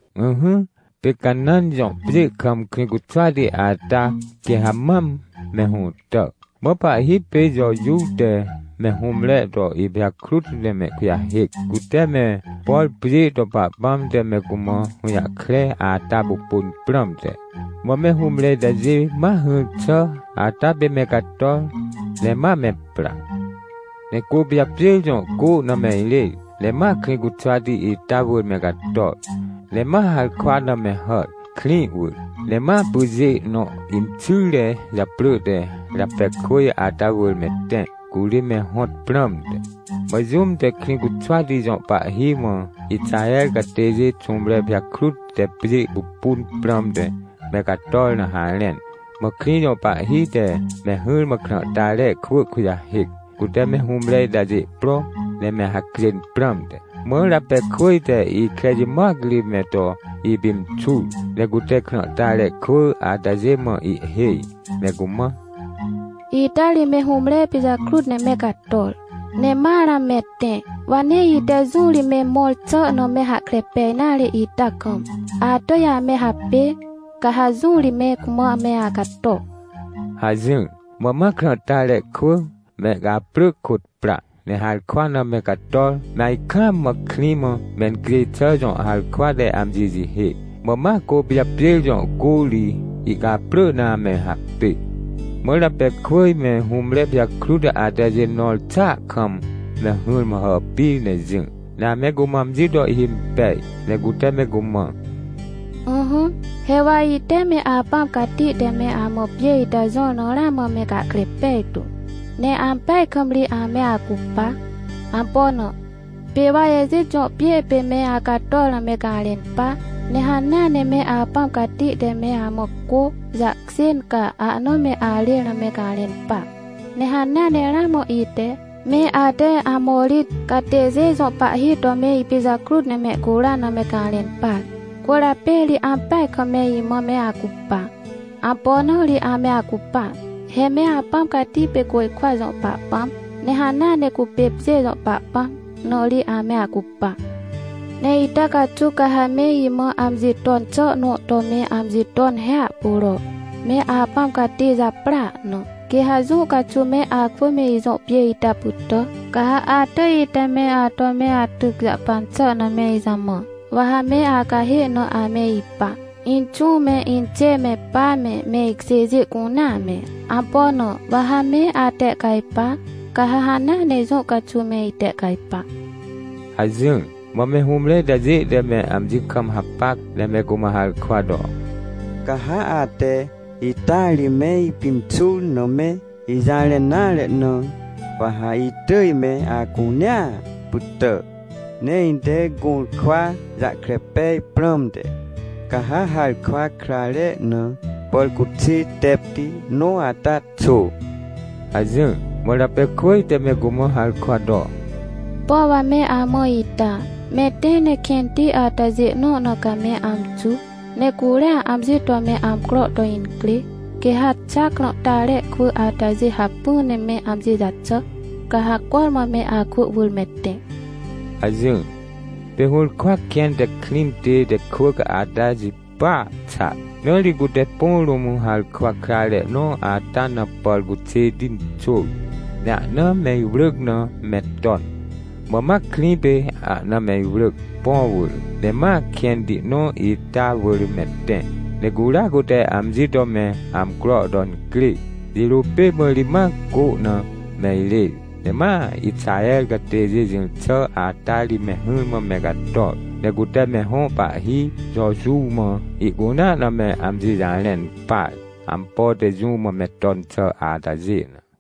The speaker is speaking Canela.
Ỹhỹ, pê Canãn jõ pjê kam Krĩcuxwati ata quê ha mam me hũtà. Mã pahhi pê Jojuw te me hũmre to ipijakrut ne mehkujahêc, cute me, por pjê to Pahpãm te me cumã hũjahkre ata pupunprãmte. Mã me hũmre itajê mahỹr xà ata pê me cator, ne ma me pra. Ne Côpijapjêr jõ cô na meirêr, ne ma Krĩcuxwati ita wỳr me cator, ne ma harkwa na me hàr, krĩ wỳr, ne ma pyjê nõ inxyre japrỳ te Rapekwỳj ata wỳrme tẽ, curi me hõt prãmte. Mã jũm te Krĩcuxwati jõ pahhi mã Ixahercatêjê xũmre pijakrut te pjê pupun prãmte me cator na harẽn. Mã krĩ jõ pahhi te me hỹrmã krãhtare kwỳ kujahêc, cute me hũmreitajê pro, ne me hacjên prãmte. Mã Rapekwỳj te ikre jimoac ri me to ipimxur. Ne cute krãhtare kwỳ atajê mã ihhêj, ne cumã: — Ita ri me hũmre pijakrut ne me cator, ne ma ramã me tẽ. Wa nee ite jũ ri me mõr xà na me hahkre pej nare ita kam, atỳjame hapê. Ca ha jũ ri me cumã me acato — hajỹr. Mã ma krãhtare kwỳ, mehcaprỳ kôt pra. Ne harkwa na me cator me ajkaam mã krĩ mãmencjêj xà jõ harkwa te amji jihê. Mã ma Côpijapjêrjõ cô ri ihcaprỳ na ame hapê. Mã Rapekwỳj me hũmrepijakrut atajê nõr xàa kam me hỹrmã hàpir ne jỹ, ne ame cumã amji toihhimpej, ne cute me cumã: — Ỹhỹ, he wa ite me Apãm Cati te me amã pjê ita jõr na ramã me gahkre pejtu. Ne ampeaj kam ri ame acupa. Ampo na? Pê wa Ejit jõ pjê pê me acator na me garẽn pa, ne hanea neme Apãm Cati te me amã cô jahkjên, ca ahna me arêr na me garẽn pa. Nehanea ne ramã ite, me ate Amorit catêjê jõ pahhi to me ipijakrut nemehcuran na me garẽn par. Cwỳrjapê ri ampeaj kam me imã me acupa. Ampona ri ame acupa? He me Apãm Cati pê côjkwa jõ Pahpãm, ne hanea ne cupêpjê jõ Pahpãm, na ri ame acupa. — Ne ita caxuw ca ha me imã amji ton xànõ to me amji ton hiahpuro, me Apãm Cati japrỳa na. Quê ha jũ caxuwme akwỳ me ijõ pjê ita pytà, ca ha atỳj ite me ato me atyc jahpan xà na me ijamã. Wa ha me acahê na ameipa, inxũ me, inxê me, pa me, me ikjêjê cunea me. Ampo na? Wa ha meatehcajpa, ca ha hanea ne jũ caxuw me itehcajpa — hajỹr. Mã me hũmreitajê te me amji kam hapac, ne me cumã harkwa to: — Ca ha ate ita ri me ipimxur na me ijarẽn nare na, wa ha itỳj me acunea pytà. Ne ite gũrkwa jahkre pej prãmte ca ha harkwa krare na pàrcuxê tepti nõ ata xô — hajỹr. Mã Rapekwỳj te me cumã harkwa to: — Pom wa me amã ita. Me tẽ ne kẽnti atajê nõ na ca me amxu, ne curiaamji to me amcro to incrê, quê ha xa krãhtare kwỳ atajê hacpỹ ne meamji jaxà, ca ha cormã me akwỳ wỳr me tẽ — hajỹr. Pê hũrkwa kẽn te krĩ tête kwỳc ata jipya xa. Na ri cute põ rũm harkwa krare nõ atana pàr cuxêti xôr, ne ahna me iwrỳc na me ton. Mã ma krĩ pê ahna me iwrỳc, põ wỳr. Ne ma kẽnti nõ ita wỳr me tẽ, ne curia cuteamji to me amcro to incrê. Jirô pê mã ri ma cô na me irêr, ne ma Ixahercatêjê jỹr xà ata ri me hỹrmã me cator. Ne cute me hõ pahhi Jojuw mã ihcunea na me amji jarẽn par, ampo te jũ mã me ton xà atajê na.